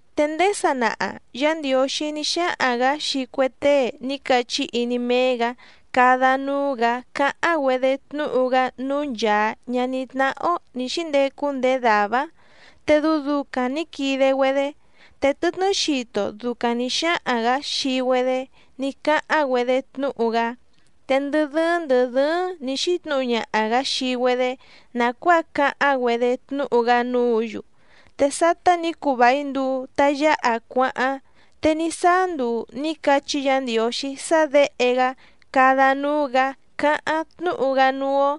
Te ndéé sanaha, Yá Ndiǒxí ní xáhaⁿ‑gǎ xii cue tée ní cachí iní méé‑gǎ cada núú‑gǎ cáháⁿ‑güedé tnúhu‑gá núú nchàa ñaní tnáhá‑ó nǐ xíndecu ndéé dàvá‑áⁿ te dɨu ducaⁿ nǐ quide‑güedé. Te tɨtnɨ́ xito ducaⁿ nǐ xáhaⁿ‑gǎ xii‑güedé ní cáháⁿ‑güedé tnúhu‑gá. Te ndɨ dɨ́ɨ́ⁿ ndɨ̀ dɨ́ɨ́ⁿ nǐ xítnǔhu ñaha‑gǎ xii‑güedé nàcuáa cáháⁿ‑güedé tnúhu‑gá núǔ‑yu. Te sátá nǐ cuu vài nduu ta yáha cuáháⁿ, te ní sáá nduu nǐ cachí Yǎ Ndiǒxí sá Děhe‑gá cada núú‑gǎ cáháⁿ tnúhu‑gá núú‑ó.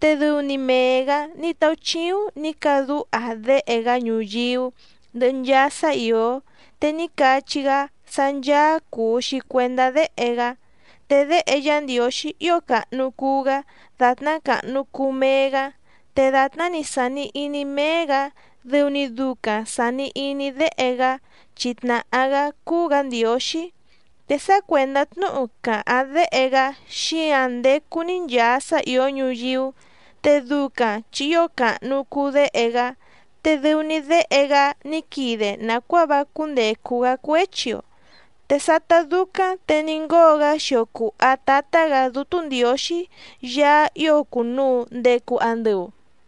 Te dɨu‑ni mee‑gǎ ní táúchíúⁿ nǐ cadúha Déhe‑gá ñuyíú ndɨhɨ nchaa sá ìó, te ní cachí‑gá sá ncháá cùu‑xi cuendá Déhe‑gá. Te Déhe Yá Ndiǒxí ío càhnu cuu‑gá dàtná càhnu cuu mee‑gá, te dàtná‑ni sàni iní méé‑gǎ dɨu‑ni ducaⁿ sàni iní Déhe‑gá chi tnàhá‑gá cúú‑gǎ Ndiǒxí, te sá cuèndá tnúhu càháⁿ Déhe‑gá xíǎⁿ ndécú‑ní nchàa sá ìó ñuyíú, te ducaⁿ chi ío càhnu cuu Déhe‑gá, te dɨu‑ni Déhe‑gá ní quide nàcuáa vá cúndècu‑gá cuéchi‑o. Te sátá dúcáⁿ te ní ngóo‑gá xio cùha Tátá‑gǎ Dútú Ndiǒxí Yaá ío cùnuu ndecu andɨu.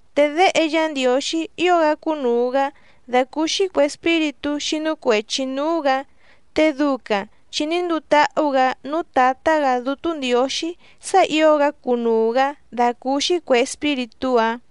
Te Déhe Yá Ndiǒxí ío‑gá cúnùu‑gá dàcúúxí cuè espíritú xínú cuèchi núú‑gǎ, te ducaⁿ chi ní nduu táhú‑gǎ núú Tǎtá‑gǎ Dútú Ndiǒxí sá ǐo‑gá cunuu‑gǎ dàcúúxí cuè espíritú‑áⁿ.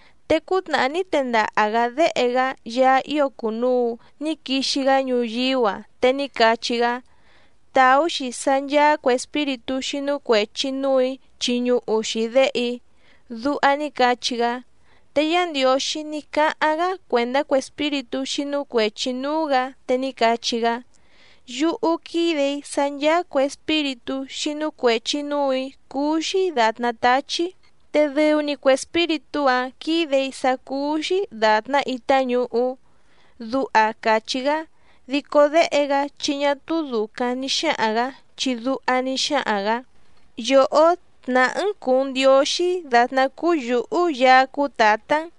Te cútnàhá ní tendaha‑gǎ Déhe‑gá Yaá ío cùnuu ní quixi‑gá ñuyíú‑a, te ní cachí‑gá: Tàú‑xi sá ncháá cuè espíritú xínú cuèchi núù‑í chiñuhu‑xi Déhe‑í. Duha ní cachí‑gá. Te Yá Ndiǒxí ní cáháⁿ‑gá cuèndá cue espíritú xínú cuèchi núú‑gǎ, te ní cachí‑gá: Yúhú quídè‑í sá ncháá cuè espíritú xínú cuèchi núù‑í cúú‑xí dàtná táchí, te dɨu‑ni cue espíritú‑áⁿ quídè‑í sá cúú‑xí dàtná itá ñuhú. Duha càchí‑gá. Dico Déhe‑gá chi ñá túú dùcaⁿ ni xáhaⁿ‑gǎ, chi duha ní xáhaⁿ‑gǎ: Yòhó tnàhá‑n cùu‑n Ndióxí dàtná cúú yǔhú Yaá cúú Tǎtá‑n,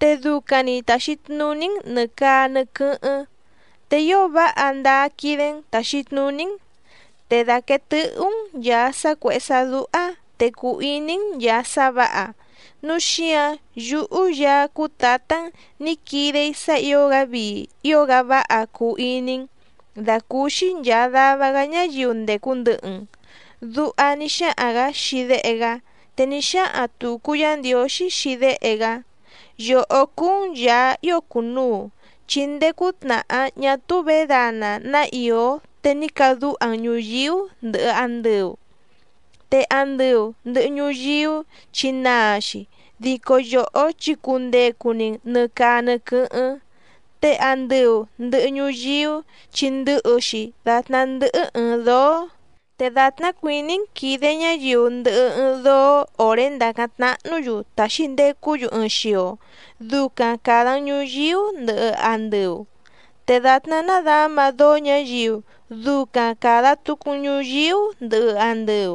te ducaⁿ‑ni tàxi tnuní‑n nɨ̀ caa nɨ quɨ́hɨ́ⁿ, te ío váha ndáá quídé‑n tàxi tnuní‑n. Te dàquee tɨhú‑n nchàa sá cuèhé sá dúhá, te cùu iní‑n nchàa sá vǎha, núu xíǎⁿ yúhú Yaá cúú Tǎtá‑n nǐ quide‑í sá ǐo‑gá vii ío‑gá váha cuu iní‑n, dàcúúxí nchàa dava‑gá ñáyiu ndècu ndɨhɨ‑n. Duha ní xáhaⁿ‑gǎ xii Déhe‑gá. Te ní xáhaⁿ tùcu Yá Ndiǒxí xii Déhe‑gá: Yòhó cúú‑n Yàá ío cùnuu, chi ndéé cútnàhá ñá túú vědana ná ìó te ní cadúha‑n ñùyíú ndɨhɨ andɨu. Te andɨu ndɨ̀hɨ ñuyíú chi naa‑xi, dico yòhó chi cundecu‑ni‑n nɨ̀ caa nɨ quɨ́hɨ́ⁿ. Te andɨu ndɨ̀hɨ ñuyíú chi ndɨhɨ‑xi dàtná ndɨ́hɨ́ ɨ̀ɨⁿ dóó, te dàtná cuìní‑n quìde ñáyiu ndɨhɨ ɨɨⁿ dóó òré ndàcáⁿ tnáhnǔ‑yu tàxi ndecú‑yu ɨɨⁿ xio, ducaⁿ càda‑n ñuyíú ndɨhɨ andɨu, te dàtná nádǎma dóó ñǎyiu ducaⁿ càda tucu‑n ñuyíú ndɨhɨ andɨu.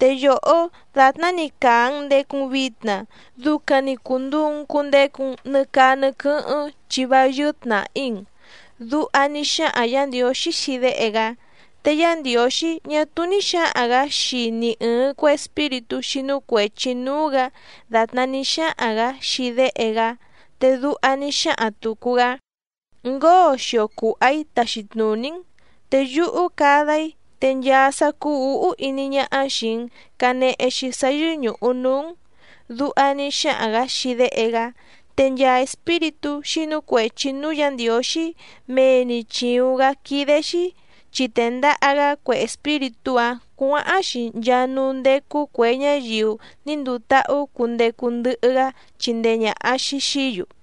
Te yòhó dàtná‑ni càa‑n ndecu‑n vitna ducaⁿ‑ni cùnduu‑n cundecu‑n nɨ caa nɨ quɨ́hɨ́ⁿ, chi vá yɨ́ɨ́ tnàhí‑n. Duha ní xáhaⁿ Yǎ Ndiǒxí xii Déhe‑gá. Te Yá Ndiǒxí ñá túú ní xǎhaⁿ‑gǎ xii ni ɨ̀ɨⁿ cue espíritú xínú cuèchi núú‑gǎ dàtná ní xáhaⁿ‑gǎ xii Déhe‑gá, te duha ní xáhaⁿ tùcu‑gá: Ngóo xio cùha‑í taxi tnùní‑n, te yúhú cada‑í te nchaa sá cúú ǔhú iní ñáhá xìi‑n canehe‑xi sá yɨ́ñùhu núú‑n. Duha ní xáhaⁿ‑gǎ xii Déhe‑gá. Te nchaa espíritú xínú cuèchi núú Yǎ Ndiǒxí mee‑ni chìuⁿ‑gá quídé‑xí, chi tèndaha‑gá cue espíritú‑áⁿ cuǎháⁿ‑xi nchaa núú ndécú cuè ñáyiu ní nduu táhú cundecu ndɨhɨ‑gá chindee ñàha‑xi xií‑yu.